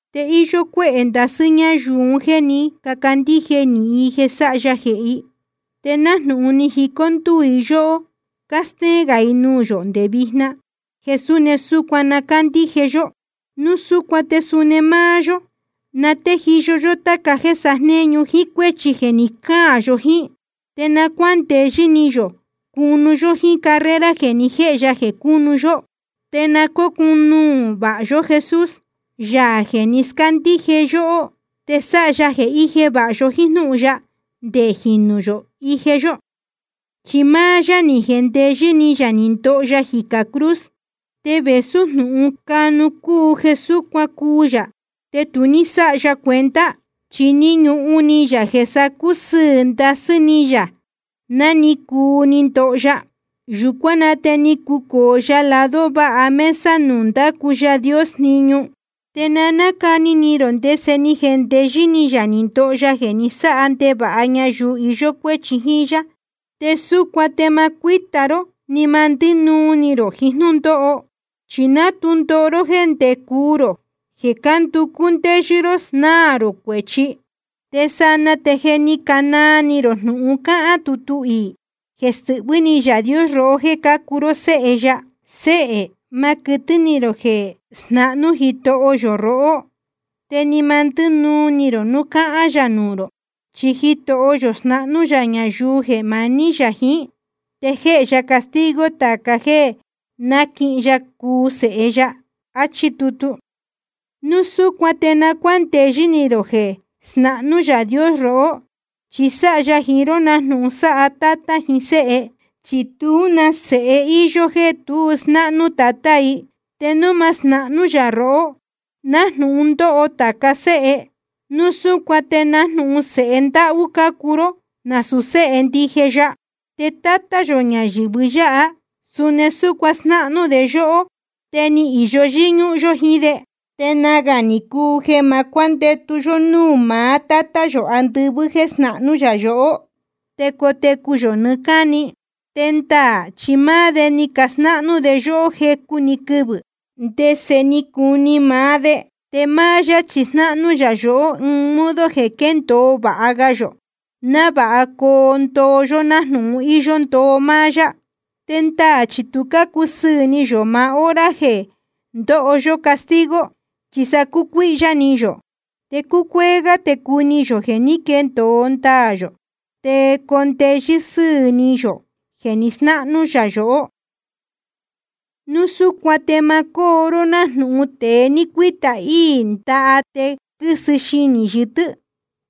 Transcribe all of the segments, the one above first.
Te íyó cuéhē ndasɨ́ ñáyuu un jéē ní cacandíje nīhin i jeē sáha ya jehē i, te nájnūhun ni jicó ndúū i yóhó, cástéén gā i nuū yō nde vijna jeē suni súcuan na cándíje yó. Núu súcuan te suni máá yó, na téjiyo yó táca jéē sajnéñu jíín cuéchi jeē ni cáan yó jíín. Te na cuándeyɨ́ ni yō cunu yó jíín carrera jeē ni jéhe ya jeē cunu yó. Te na cócunuū vāha yó Jesús, Yaā jeē ni scándíje yóhó te sáha ya jeē íje vāha yó jíín jnúhun ya nde jīnu ije yó. Chi máá yá ni jendeyɨ́ ni yā ni ndoho ya jicā cruz. Te vēsú jnūhun canu cúu jeē súcuan cuu yā, te tu ní sáha ya cuenta. Chi ni ñuhun ni yā jeē sa cusɨɨ̄ ndasɨ́ ni yā ná ni cuu ni ndoho ya. Yūcuán na te ni cucōo ya lado váha mesa nuū ndácu Yaā Dios jniñu. Te na nácani ni rō ndese ni jendeyɨ́ ni yā ni ndoho ya jeē ni sáha ndevāha ñayuu iyó cuéchi jíín yá. Te súcuan te ma cuíta ró ni ma ndínuu ni rō jiín jnúndóho. Chi ni ná tu ndoho ró jéē ndé cuu rō jeē cánducú ndéyɨ́ ró snáā rō cuēchi. Te sanaa te je ni canaa ni rō jnūhun cáhán tutu iī, jeē stɨhvɨ́ ni Yaā Dios rohó jéē cácuu ró séhe ya: Séhē, ma quɨtɨ́ ni rō jeē snahnú Jitoho yō rohó, te ni ma ndínuu ni rō núu cáhán yā nuū rō. Chi Jitoho yō snáhnú yā ñayuu jeē maní yā jiín, te jéhe ya castigo tāca jéē náquihin ya cuu sēhe ya. Achí tutu. Núu súcuan te na cuándeyɨ́ ni rō jeē snahnú Yaā Dios rohó, chi sáha ya jiín ró nájnūhun sáha tátá jiín séhe. Chi tú na sēhe íyó jéē tu snáhnú tatá i. Te núu ma snahnú yā rohó, nájnūhun ndóho tāca séhe, núu súcuan te nájnūhun sēhe ndáhú cácuu ró, nasūu séhe ndije ya. Te tátá yō ñayɨ̄vɨ yáha, suni ni snahnú de yóhó, te ni īyo yɨ́ñúhún yó jíín de. Te nagā ni cuu jeē ma cuándetū yō nuū maá Tátá yō andɨvɨ́ jeē snahnú yā yohó, te cotecu yō nɨɨ́ cáni. Te ndaā chi máá de ni casnáhnú de yóhó jecu‑ni quɨvɨ̄, ndese ni cuu ni maá de. Te máá yá chi snáhnú yā yohó ɨɨn modo jeē quéndōo vāha ga yō, návāha coo ndoo yó nájnūhun íyó ndoo máá yá. Te ndaā chi tu cácusɨɨ̄ ni yō maá hora jeē ndóho yó castigo, chi sa cúcuíhyá ni yō. Te cúcuéé gá te cuni yō jeē ní quendōo ndaā yō te coo ndeyɨ́ sɨ́ɨ̄ ni yō jeē ni snáhnú yā yohó. Núu súcuan te ma cóo ró nájnūhun tēe ni cuīta íī ndaha te quɨ́sɨ i xinī yɨtɨ́,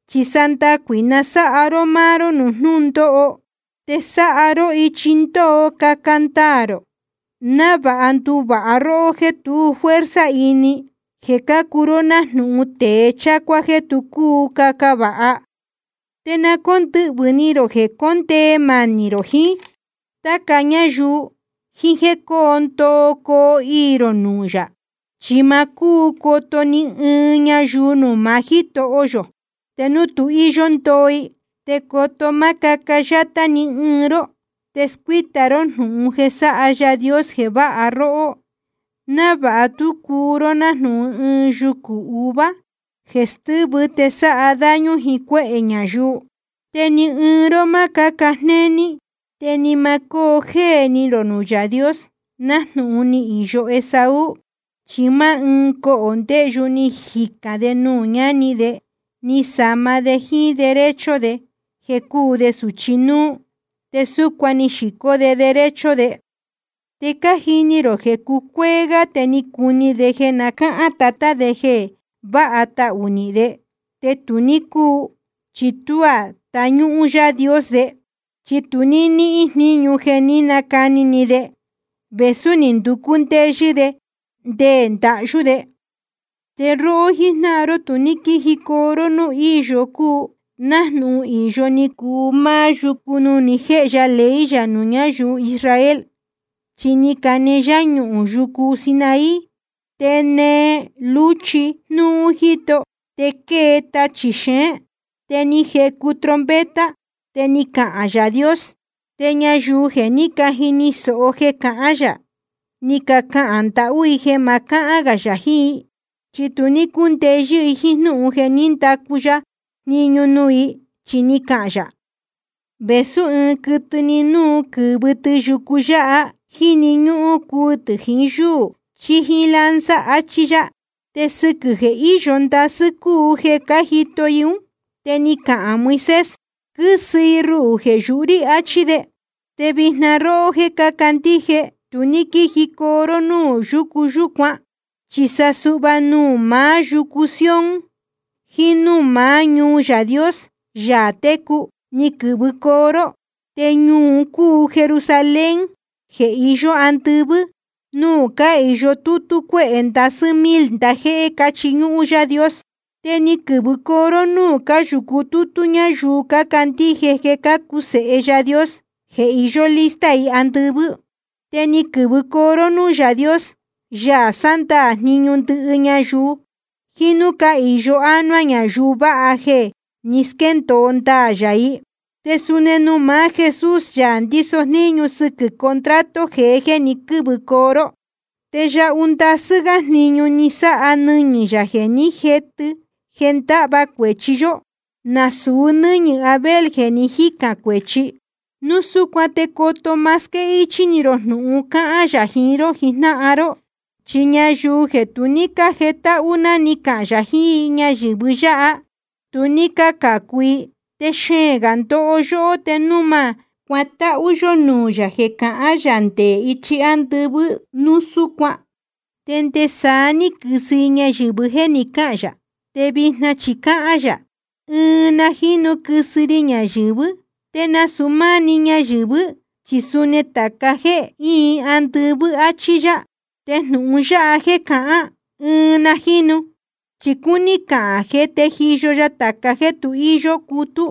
chi sa ndacuī na sáha ró máá ró nuū jnúndóho. Te sáha ró ichi ndóó caca ndaā rō, návāha nduvāha róhó jéē tu fuerza ini, jeē cácuu ró nájnūhun tēe chácuá jeē tu cúu caca vāha. Te na cóndɨhvɨ̄ ni rō jeē condee manī rō jiín táca ñáyuu, jíín jéē cóo ndoo coo iī rō nuū yā. Chi ma cúu coto ni ɨɨn ñayuu nuū maá Jítoho yō te núu tu íyó ndoo i. Te coto má cáca yátá ni ɨɨn ró te scuíta ró jnúhun jeē sáha Yaā Dios jeē váha róhó, návāha tú cuu ró nájnūhun ɨɨn yucū uvuá jeē stɨ́vɨ te sáha daño jiín cuéhē ñayuu. Te ni ɨɨn ró ma cáca jnéní. Te ni ma cóo jéē ni rō nuū Yaā Dios, nájnūhun ni īyo Esaú. Chi máá ɨɨn cohō ndeyu ni jicān de nuū ñáni de, ni sama de jíín derecho de jeē cúu de sūchi núú, te súcuan ni xīcó de derecho de. Te cájini rō jeē cucuéé gá te ni cuni de jeē na cáhán tatá de jeē váha tahū nihīn de, te tu ní cúu, chi tuá ni táñúhún Yaā Dios de. Chi tu ní níhīn jníñu jeē ní nacani ni de, vēsú ni nducú ndéyɨ́ de te nde ndahyú de. Te róhó jíjnáhan ró tu ní quíjicoo ró núū íyo cúu, nájnūhun īyo ni cuu máá yucu nuū ni jéhe ya ley yā nuū ñáyuu Israel. Chi ni cane yáñuhūn yucu Sinaí, te nee lúchi jnúú jíto, te quée tachī xeén. Te ni jecu trompeta, te ni cahān Yaā Dios. Te ñayuu jeē ní cajini sōho jeē cahán yā, ni cacahān ndahú i jeē ma cahán gā yā jiín i. Chi tu ní cúndeyɨ́ i jíín jnúhun jeē ní ndacu ya jniñu nuū i, chi ni cahān yā: Vēsú ɨɨn quɨtɨ‑ni núu quɨ̄vɨ tɨ yucu yáha, jíni ñúhún cuu tɨ̄ jiín yúū chí jíín lanza, achí yá. Te sɨquɨ̄ jeē íyo ndasɨ́ cúu jeē cájito i ún, te ni cahān Moisés: Quɨ́sɨ i ruhū jeē yuhú rí, achí de. Te vijna róhó jéē cácandíje, tu ní quíjicoo ró núū yúcu yúcuan. Chi sa suhva nuū maá yucu Sion jiín núū maá ñuu Yaā Dios, Yaā técu, ni quɨ̄vɨcoo ró. Te ñuu un cúu Jerusalén jeē iyó andɨvɨ́, nuū cáhīyo tútú cuéhē ndasɨ́ mil ndajéhé cáchiñúhún Yaā Dios. Te ni quɨ̄vɨcoo ró núū cáyūcu tútú ñáyuu cácandíje jeē cácuu sēhe Yaā Dios, jeē iyó lista i andɨvɨ́. Te ni quɨ̄vɨcoo ró núū Yaā Dios, Yaā sándaā jniñu ndɨhɨ ñayuu, jiín núū cáhīyo ánuá ñayuu vāha jeē jé ni squéndōo ndaā yā i. Te suni nuū maá Jesús, Yaā ndíso jníñu sɨquɨ̄ contrato jeé ní quɨ̄vɨcoo ró. Te yahu ndasɨ́ gá jniñu sáha nɨñɨ̄ yā jeē ni jétɨ jeē ndáhva cuēchi yó, nasūu nɨ́ñɨ̄ Abel jeē ni jícān cuēchi. Núu súcuan te coto má squéhichī rō jnūhun jeē cahán yā jiín ró jijnáhan ró. Chi ñayuu jeē tu ní cájetáhú ná ni cahān yā jiín i ñayɨ̄vɨ yáha, tu ní cácācu i. Te xeēn gā ndoho yóhó te núu ma cuatáhú yó nuū yā jeē cahán yā nde ichi ándɨvɨ́ núu súcuan. Te nde saá ní quɨsɨ i ñayɨ̄vɨ jéē ni cáhān yā. Te vijna chi cáhán yā: Ɨɨn na jínu quɨsɨ ri ñayɨ̄vɨ́, te nasūu máá‑ni ñayɨ̄vɨ́, chi suni tāca jéē íin andɨvɨ́, áchí yá. Te jnūhun yáha jéē cahán, ɨɨn na jínu, chi cúní cahān jeē téjiyo ya tāca jéē tu íyó cutú,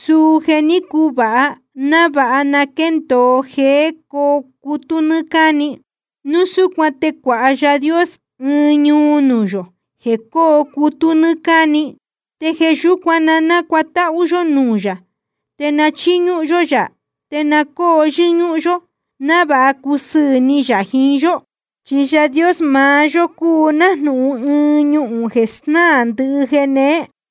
suu jeē ní cuvāha, návāha na quéndōo jeē cóo cutú nɨ́ɨ́ cáni. Núu súcuan te cuāha Yaā Dios ɨɨn ñuu nuū yō jeē cóo cutú nɨ́ɨ́ cáni. Te jeē yúcuan, na nácuatáhú yó nuū yā, te na chíñúhún yó yā, te na cóo yɨ́ñúhún yó, návāha cusɨɨ̄ ni yā jiín yó. Chi Yaā Dios maá yó cúu nájnūhun ɨɨn ñuhūn jeē snáā ndɨhɨ jeē neé.